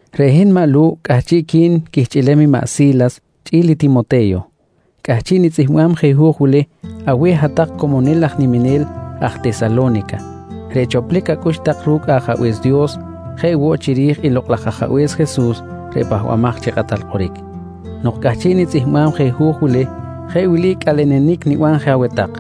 Reꞌ hin maꞌ Lu̱ꞌ chi cꞌahchiꞌqui̱n quihchꞌilem i maꞌ Si̱las chꞌi̱l i Timote̱yo, cꞌahchiꞌ nitzꞌihmbam je hu̱j wili aweh hat-tak comonil aj niminel aj Tesalo̱nica reꞌ choplic acꞌux tak ru̱cꞌ Ajabe̱s Dios jeꞌ woꞌ chiri̱j i Lokꞌ laj Ajabe̱s Jesus reꞌ Pahbamaj chi Kꞌatal Kꞌoric. Nok cꞌahchiꞌ nitzꞌihmbam je hu̱j wili, jeꞌ wili cꞌalenenic niban je aweh tak: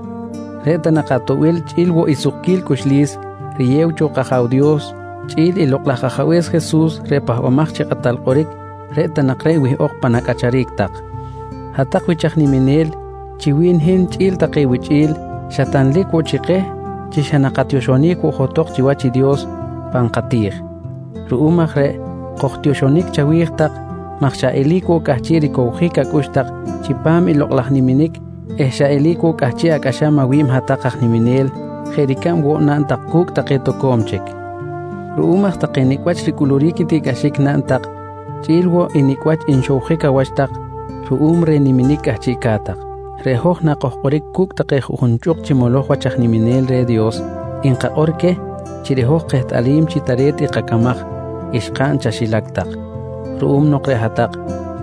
Reꞌ ta nak atoꞌbil chꞌi̱l woꞌ i sukquil cꞌuxlis riyew cho kAja̱w Dios chꞌi̱l i Lokꞌ laj Ajabe̱s Jesus reꞌ Pahbamaj chi Kꞌatal Kꞌoric, reꞌ ta nak reꞌ wihꞌok pan acꞌacharic tak. Hat-tak wich aj niminel, chi wi̱n hin chꞌi̱l take wichꞌi̱l xa tanlic woꞌ chi keh chi xa nakatioxonic woꞌ johtok chiwach i Dios pan kati̱j. Ruꞌum aj reꞌ kojtioxonic chawi̱j tak maj xa eli̱c woꞌ cꞌahchiꞌ ricowjic acꞌux tak chipam i lokꞌ laj niminic eh xa eli̱c woꞌ cꞌahchiꞌ acꞌaxam awi̱b hat-tak aj niminel jeꞌ ricab woꞌ naꞌn tak cu̱cꞌ take toco̱m chic. Ruꞌum aj take nicꞌ wach ricꞌuluric i tiꞌcꞌaxic naꞌn tak chꞌi̱l woꞌ i nicꞌ wach nxowjic awach tak ruꞌum reh niminic cꞌahchiꞌca̱t tak, reꞌ hoj nakojkꞌoric cu̱cꞌ take juꞌjun chꞌuk chi moloj wach aj niminel reh Dios, nkakꞌor queh chi reꞌ hoj kehtꞌalim chi tare̱t i kacamaj xkaꞌn chaxilac tak ruꞌum nok reꞌ hat-tak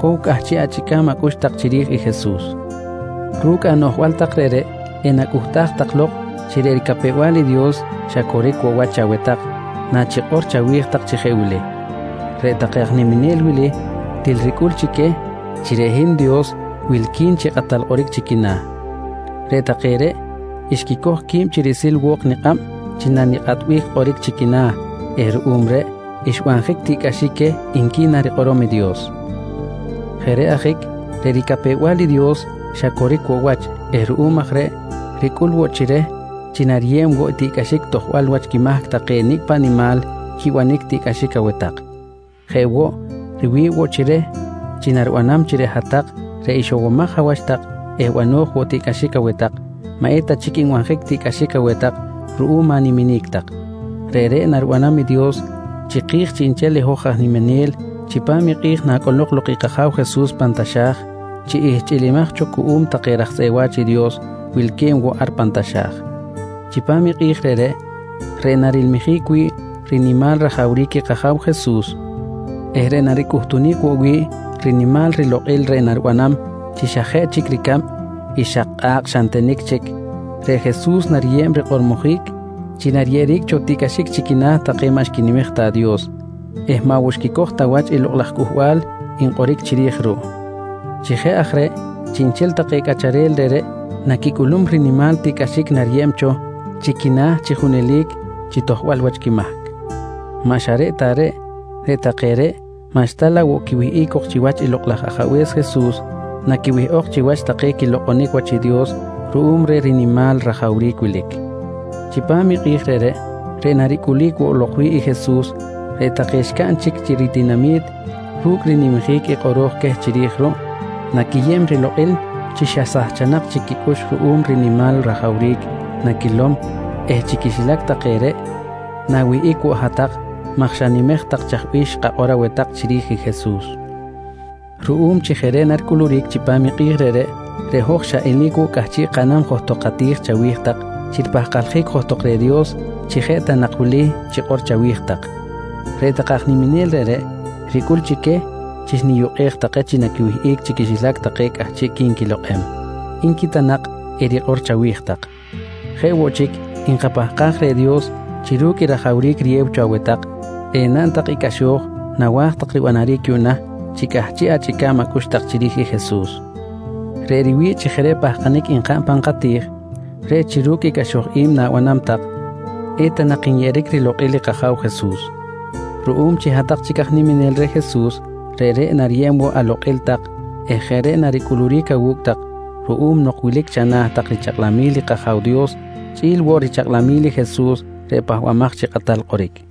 cow cꞌahchiꞌ achꞌica̱b acꞌux tak chiri̱j i Jesus. Ru̱cꞌ anoꞌjbal tak reꞌreꞌ, enacꞌuhtaj tak lok chi reꞌ ricapew-bal i Dios xa coric woꞌ wach chaweh tak nachikꞌor chawi̱j tak chi jeꞌ wili: «Reꞌ take aj niminel wili, til ricꞌul chi queh chi reꞌ hin Dios wilqui̱n chi kꞌatal kꞌoric chi quina̱. Reꞌ take reꞌ xquicoj qui̱b chi riꞌsil wo̱k nikꞌab chi nanikꞌatbic kꞌoric chi quina̱ eh ruꞌum reꞌ xbanjic tiꞌcꞌaxic queh, nqui narikꞌorom i Dios. Jeꞌ reꞌ ajic reꞌ ricapew-bal i Dios xa coric woꞌ wach eh ruꞌum aj reꞌ ricꞌul woꞌ chi reh chi nariyeb woꞌ tiꞌcꞌaxic tojbal wach quimahc take nicꞌ paꞌ nimal quibanic tiꞌcꞌaxic aweh tak. Jeꞌ woꞌ, riwi̱ꞌ woꞌ chi reh chi naribanam chi reꞌ hat-tak reꞌ ixowomaj awach tak eh bano̱j woꞌ tiꞌcꞌaxic aweh tak, maꞌ eta chic nbanjic tiꞌcꞌaxic aweh tak ruꞌum animinic tak. Reꞌreꞌ naribanam i Dios chiki̱j chiꞌnchel i hoj aj niminel chipam i kꞌi̱j nacꞌolok lok i kAja̱w Jesus pan taxa̱j chi ihchꞌilimaj cho cuꞌum take raj tzꞌeꞌ wa̱ch i Dios wilque̱b woꞌ ar pan taxa̱j. Chipam i kꞌi̱j reꞌreꞌ, reꞌ narilmijic wi̱ꞌ rinimal rajawric i kAja̱w Jesus eh reꞌ naricꞌuhtunic woꞌ wi̱ꞌ rinimal rilokꞌil reꞌ naribanam chi xa jeꞌ chic ricab i xak kꞌa̱kꞌ xa ntenic chic, reꞌ Jesus nariyeb rikꞌormojic chi nariyeꞌeric cho tiꞌcꞌaxic chi quina̱ take maꞌ xquinimej ta Dios eh maꞌ woꞌ xquicoj ta wach i lokꞌ laj cꞌuhbal nkꞌoric chiri̱j ruꞌ. Chi jeꞌ aj reꞌ, chiꞌnchel take cꞌacharel reꞌreꞌ naquicꞌulum rinimal tiꞌcꞌaxic nariyeꞌeric cho chi quina̱ chi junelic chi tojbal wach quimahc. Maꞌ xa reꞌ ta reꞌ, reꞌ take reꞌ maꞌxta laꞌ woꞌ quiwihꞌic cok chiwach i Lokꞌ laj Ajabe̱s Jesus naquiwihꞌok chiwach take naquilokꞌonic wach i Dios ruꞌum reh rinimal i rajawric wilic. Chipam i kꞌi̱j reꞌreꞌ, reꞌ naricꞌulic woꞌ lok wi̱ꞌ i Jesus, reꞌ take xcaꞌn chic chi ritinami̱t ru̱cꞌ rinimjic i kꞌoro̱j queh chiri̱j ruꞌ, naquiyeb rilokꞌil chi xa sahchanak chic quicꞌux ruꞌum reh rinimal rajawric naquilom eh chi quixilac take reꞌ, na̱wihꞌic woꞌ hat-tak maj xanimej tak chaj bih xkakꞌor aweh tak chiri̱j i Jesus. Ruꞌum chi jeꞌ reꞌ naricꞌuluric chipam i kꞌi̱j reꞌreꞌ, reꞌ hoj xa eli̱c woꞌ cꞌahchiꞌ kaꞌnam johtok kati̱j chawi̱j tak chi ripahkaljic johtok reh Dios chi jeꞌ ta nak wili chikꞌor chawi̱j tak: «Reꞌ take aj niminel reꞌreꞌ, ricꞌul chi queh chi xniyukꞌej take chi naquiwihꞌic chi quixilac take cꞌahchiꞌqui̱n quilokꞌem, nqui ta nak erikꞌor chawi̱j tak. Jeꞌ woꞌ chic, nkapahkaj reh Dios chi ru̱cꞌ i rajawric riyew cho aweh tak, enaꞌn tak i cꞌaxo̱j nawa̱j tak ribanaric yuꞌna chi cꞌahchiꞌ achꞌica̱b acꞌux tak chiri̱j i Jesus. Reꞌ riwi̱ꞌ chi jeꞌ reꞌ pahkanic nkaꞌn pan kati̱j, reꞌ chi ru̱cꞌ i cꞌaxoj i̱b na̱banam tak, eta nak nyeꞌeric rilokꞌil i kAja̱w Jesus. Ruꞌum chi hat-tak chic aj niminel reh Jesus, reꞌreꞌ nariyeb woꞌ alokꞌil tak eh jeꞌ reꞌ naricꞌuluric awu̱cꞌ tak ruꞌum nok wilic chana̱ tak richakꞌlamil i kAja̱w Dios chꞌi̱l woꞌ richakꞌlamil i Jesus reꞌ Pahbamaj chi Kꞌatal Kꞌoric.